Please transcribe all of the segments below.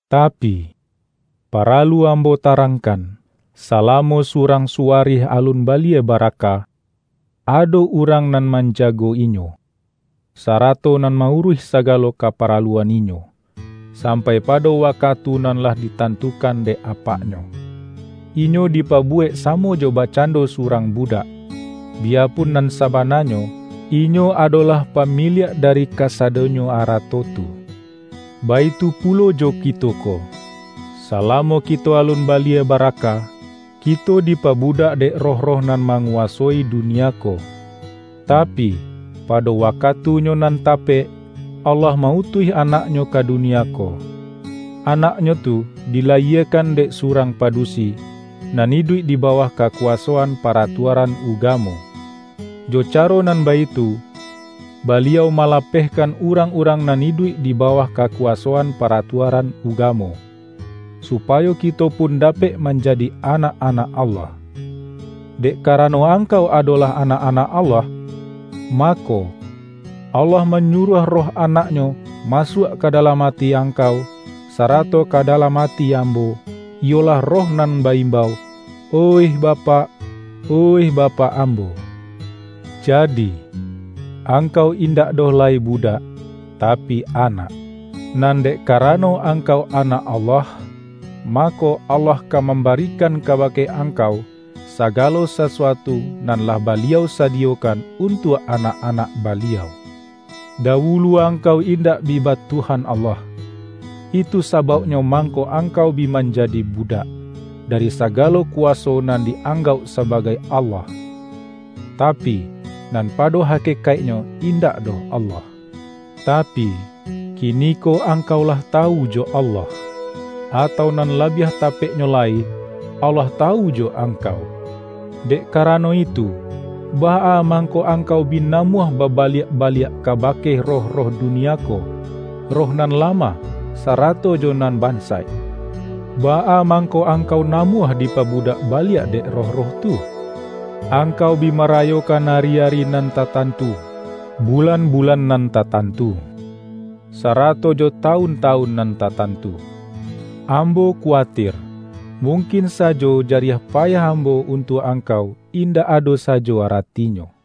Tapi, paralu ambo tarangkan: salamo surang suwarih alun balie baraka, ado urang nan manjago-inyo, sarato nan ma-uruih sagalo kaparalu-an inyo, sampai pado wakatu nan lah ditantukan dek apaknyo. Inyo dipa-buwek samo jo bakcando surang bu-dak, biyapun nan sabananyo, inyo adolah pamiliak dari kasadonyo ara-to tu. Baitu pulo jo kito ko: Salamo kito alun balie baraka, kito dipabu-dak dek roh-roh nan manguwasoi du-nia ko. Tapi, pado wakatunyo nan tapek, Allah ma-utuih Anak-Nyo ka dunia ko. Anak-Nyo tu dilayiekan dek surang padusi, nan iduik di ba-wah kakuwasoan paratuaran ugamo. Jo caro nan baitu, Baliau malapeh-kan urang-urang nan iduik di bawah kakuwasoan paratuaran ugamo; su-payo kito pun dapek manjadi anak-anak Allah. Dek karano angkau adolah anak-anak Allah, mako, Allah manyuruah Roh Anak-Nyo masuak ka dalam ati angkau, sarato ka dalam ati ambo, iyolah Roh nan ba-imbau,”Oih Ba-pak, oih Bapak ambo.” Jadi, angkau indak doh lai budak, tapi anak. Nan dek karano angkau anak Allah, mako, Allah ka mambarikan kabake angkau, sagalo sasuatu nan lah Baliau sadiyo-kan untuak anak-anak Baliau. Dawulu angkau indak bi ba Tuhan Allah, itu sabauknyo mangko angkau bi manjadi budak, dari sagalo kuwa-so nan di-anggauk sabagai allah, ta-pi, nan pado hakekaiknyo indak doh Allah. Tapi, kiniko angkau lah tawu jo Allah, atau nan labiah tapeknyo lai, Allah tawu jo angkau. Dek karano itu, baa mangko angkau bi namuah baba-liak baliak kabake roh-roh dunia ko, roh nan lamah, sarato jo nan bansaik? Baa mangko angkau namuah dipa-budak baliak dek roh-roh tu? Ang-kau bi marayokan ari-ari nan tatan-tu, bulan-bulan nan tatantu, sarato jo tawun-tawun nan tatantu. Am-bo kuwatir, mungkin sajo jariah pa-yah ambo untuak angkau indak ado sajo aratinyo.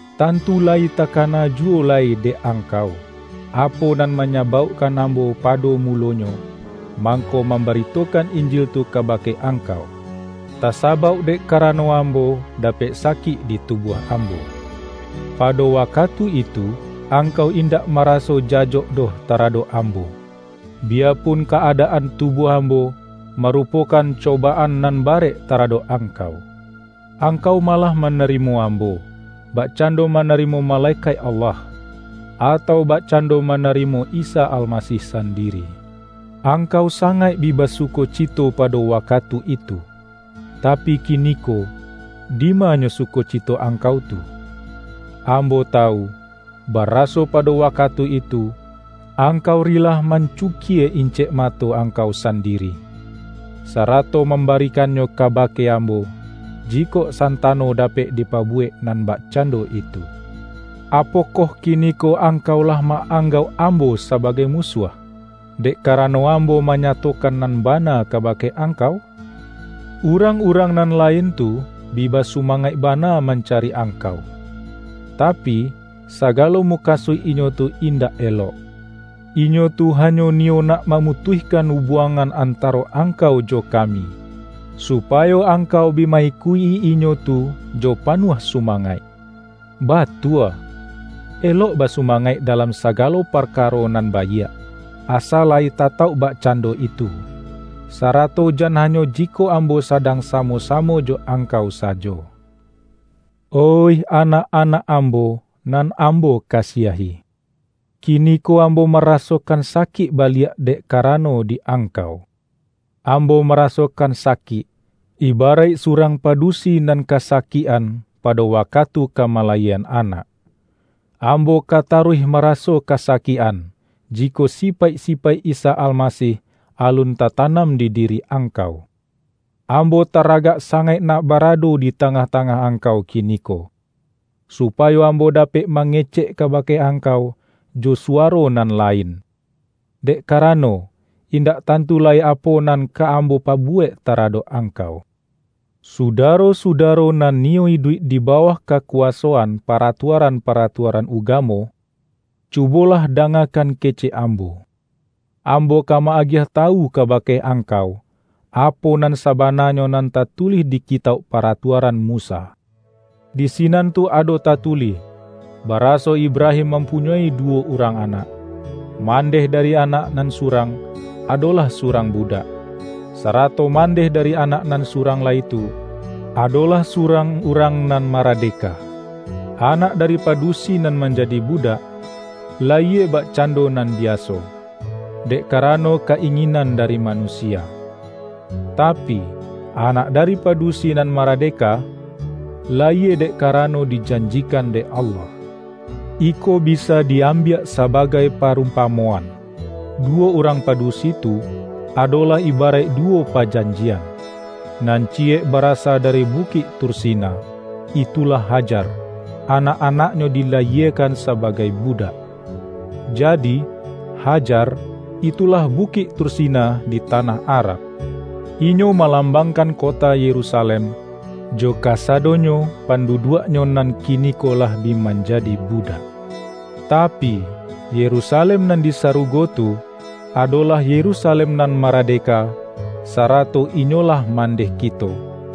Tantu layi takana juwo lai dek angkau, apo nan manyabaukkan ambo pado mulonyo, mangko mambaritokan Injil tu kabake angkau. Tasabauk dek karano ambo dapek sakik di tubuah ambo. Pado wakatu itu, angkau indak maraso jajok doh taradok ambo, biyapun ka-adaan tubuah ambo, marupokan cobaan nan barek taradok angkau. Angkau malah manarimo ambo, bakcando manarimo malekaik Allah, atau bakcando mana-rimo Isa Almasih sandiri. Angkau sangaik bi basukocito pado wakatu itu. Tapi kiniko, dimanyo sukocito angkau tu? Ambo tawu, baraso pado waka-tu itu, angkau rilah mancukie incek mato angkau sandiri, sarato mamba-rikannyo kabake ambo, jikok santa-no dapek dipabuwek nan bakcando itu. Apokoh kiniko angkau lah ma-anggauk ambo sabagai musuah, dek karano ambo manyatokan nan bana kabake angkau? Urang-urang nan lain tu bi basu-mangaik bana mancari angkau, tapi, sagalo mukasuik inyo tu indak elok. Inyo tu hanyo niyo nak mamutuihkan ubuangan antaro angkau jo kami, su-payo angkau bi ma-ikuik-i inyo tu jo panuah sumangaik. Batua, elok ba-sumangaik dalam sagalo parkaro nan baiak, asa layi tatauk bakcando itu, sa-rato jan hanyo jikok ambo sadang sa-mo-samo jo angkau sajo. Oih anak-anak ambo, nan ambo kasiahi! Kiniko ambo marasokan sakik baliak dek ka-rano di angkau. Ambo marasokan sa-kik, ibaraik surang padusi nan kasa-kik-an, pado wakatu ka malayiekan anak. Ambo ka taruih maraso kasa-kik-an, jikok sipaik-sipaik Isa Almasih alun tatanam di diri angkau! Am-bo taragak sangaik nak barado di ta-ngah-tangah angkau kiniko, supayo ambo dapek mangecek kabake ang-kau jo suwaro nan lain, dek karano, indak tantu lai apo nan ka ambo pa-buwek taradok angkau! Sudaro-sudaro nan niyo iduik di bawah kakuwasoan paratuaran-pa-ratuaran ugamo, cubolah dangakan kecek ambo! Ambo ka ma-agiah ta-wu kabake angkau, apo nan sabana-nyo nan tatulih di Kitauk Paratuaran Musa. Di sinan tu ado tatulih, ba-raso Ibrahim mampunyoi duwo urang anak: Mandeh dari anak nan surang, adolah surang budak, sarato mandeh dari anak nan surang lai tu, adolah surang urang nan maradeka. Anak dari padusi nan manjadi budak, layie bakcando nan biaso, dek karano ka-inginan dari manusia. Tapi, anak dari padusi nan maradeka, layie dek kara-no dijanjikan dek Allah. Iko bisa di-ambiak sabagai parumpamoan. Duwo urang padusi tu, adolah ibaraik duwo pajanjian: nan ciyek barasa dari Bu-kik Tursina — itulah Hajar; anak-anak-nyo dilayiekan sabagai budak. Jadi, Hajar, itulah Bukik Tursina di tanah Arab. Inyo malambangkan kota Ye-rusalem, jo kasadonyo panduduak-nyo nan kiniko lah bi manjadi budak. Tapi, Yerusalem nan di sarugo tu, adolah Yerusalem nan maradeka, sa-rato inyolah mandeh kito.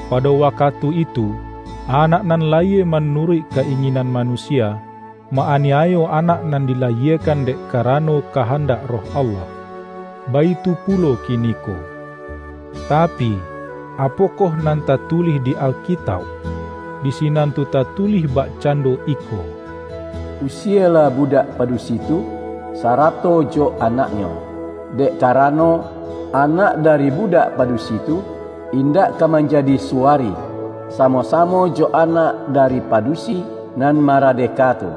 Pado wakatu itu, anak nan layie manuruik ka-inginan manusia, ma-aniayo anak nan dilayiekan dek karano kahandak Roh Allah. Baitu pulo kiniko. Tapi, apokoh nan tatulih di Alkitauk? Di si-nan tu tatulih bakcando iko:”Usielah budak padusi tu, sarato jo anaknyo, dek karano, anak dari budak padusi tu, indak ka manjadi suwarih, samo-samo jo anak dari padusi nan mara-deka tu.”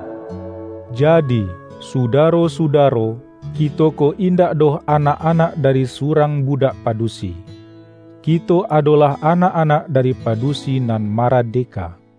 Jadi, sudaro-sudaro, kito ko indak doh anak-anak dari surang budak padusi; kito adolah anak-anak dari padusi nan maradeka.